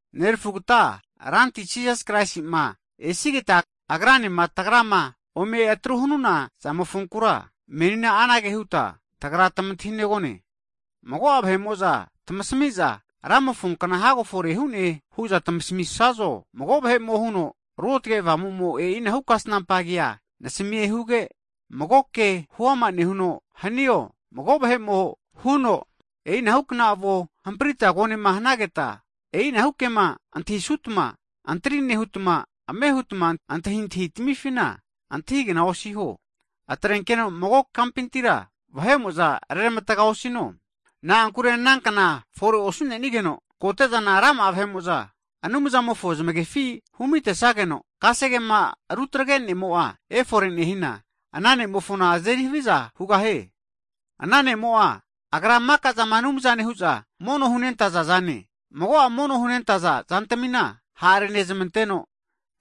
Nerefugata Ranti Jisasi Kraisi'ma esigeta, Agranema tagrama ome atru hanuna zamofonkura, menina anage huta tagra tamantahinegone. Mago'a vahe'mo'za tamasamiza Ramofo kna hago fore hu'ne hu'za tamasamisazo, mago vahe'mo huno Ruotge Avamumo e'inahu kasnampa kea nasamie huge, mago ke huama nehuno hanio, mago vahe'mo huno, e'inahukna avona hamprita konema hanageta, e'inahu kema antahisutma, antri nehutma ame hutma antahintahi tamifina antahigna osiho. Atrenkeno mago kampintira vahe'mo'za reramatga osino, na'ankure ana kna fore osu'nenigeno, kote'zana rama'a vahe'mo'za Anumzamofona zamefi humitesageno, kasegema rutagre ne'mo'a efore nehina, ana ne'mofona azeri haviza hugahie. Ana ne'mo'a agra'a maka'zama anumzane hu'za mono hunentaza'zane, mago'a mono hunentaza zantamina ha'renezmanteno,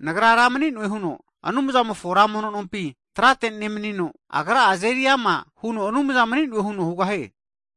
Nagra ra mni'noe huno Anumzamofo ra mono nompi trate nemnino, agra'a azeri ama huno Anumza mni'noe huno hugahie.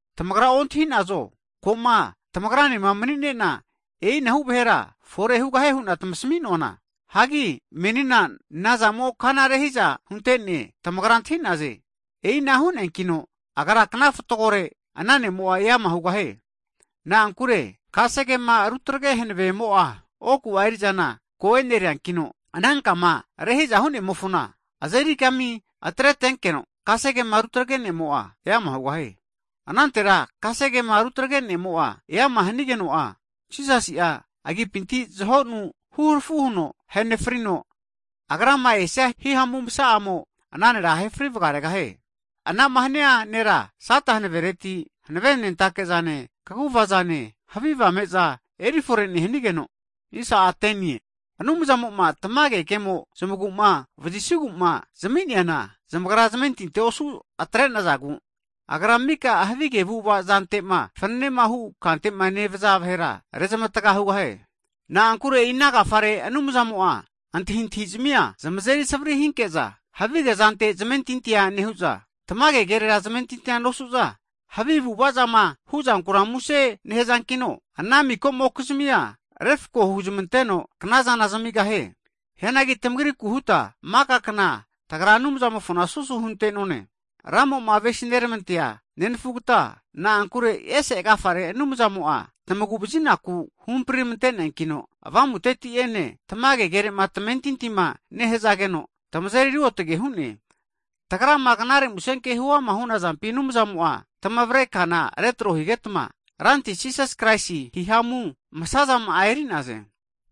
Tamagra ontahi'nazo, koma tamagranema mni'nena e'inahu vahera fore hugahie hu'na tamasaminoana? Hagi menina nazamo kana rehiza huntene, tamagra antahi'naze, e'ina hu'neankino agra'a kna fatgore ana ne'mo'a eama hugahie. Na'ankure kasegema rutagre hanavemo'a oku'a erizana ko e'neriankino, ana kama rehiza hu'nemofona azeri kami atretenkeno, kasegema rutagre ne'mo'a eama hugahie. Anantera kasegema rutagre ne'mo'a eama hanigeno, Jisas'a agipinti zahonu huharafu huno ahenefrino, Agrama esia hihamu masa'amo, ana nera ahefri vgaregahie. Anama hania ne'mo'a, Sata hanavereti hanavenentakezane, kaguvazane, havige avame'za erifore nehanigeno, Anumzamo'a zamagu'ma vazisigu'ma tamage kema zami'neana, zamagra zamentintia osu atre'nazagu, Agra mika havige avu'ava zante'ma fananema hu kantema nevaza vahera rezamatga hugahie. Na'ankure e'ina agafare Anumzamo'a antahintahizamia zamazeri savari hinke'za, havige zante zmentintia nehu'za, tamage kerera zamentinti nosu'za, havi avu'avazama hu'zanku muse nehazankino, ana miko'mokizimia refko huzamanteno knazana zamigahie. Hianagi tamagriku huta maka kna tagra Anumzamofona susu hunentone. Ramo'ma avesi'neramantea nenafugata e'se agafare Anumzamo'a tamagu'vazinaku huhampri' ramante'neankino, Avamuteti'ene tamage kerema tamentintima nehazageno, tamazeri ruotge hu'ne. Tagrama knare musenkema huama hunazampi, Anumzamo'a tamavare kana retro higetma, Ranti Jisas Kraisi hihamu masazama'a e'nerize.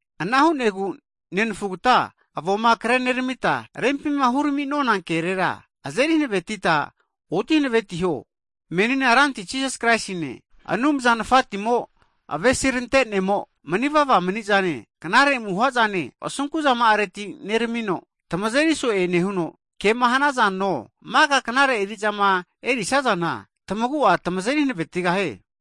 Ana hu'negu nenafugata avoma kreneramita, rempima hurami'nona kerera azeri hanavetita oti hanavetiho. Menina Ranti Jisasi Kraisine, Anumza Nafatimo, avesinerante'mo mani vava mani'zane, knare amuhazane asunkuzama'areti neramino, tamazeri so'e nehuno, kema hanazano, maka knare erizama erisazana, tamagu'a tamazeri hanavetigahie.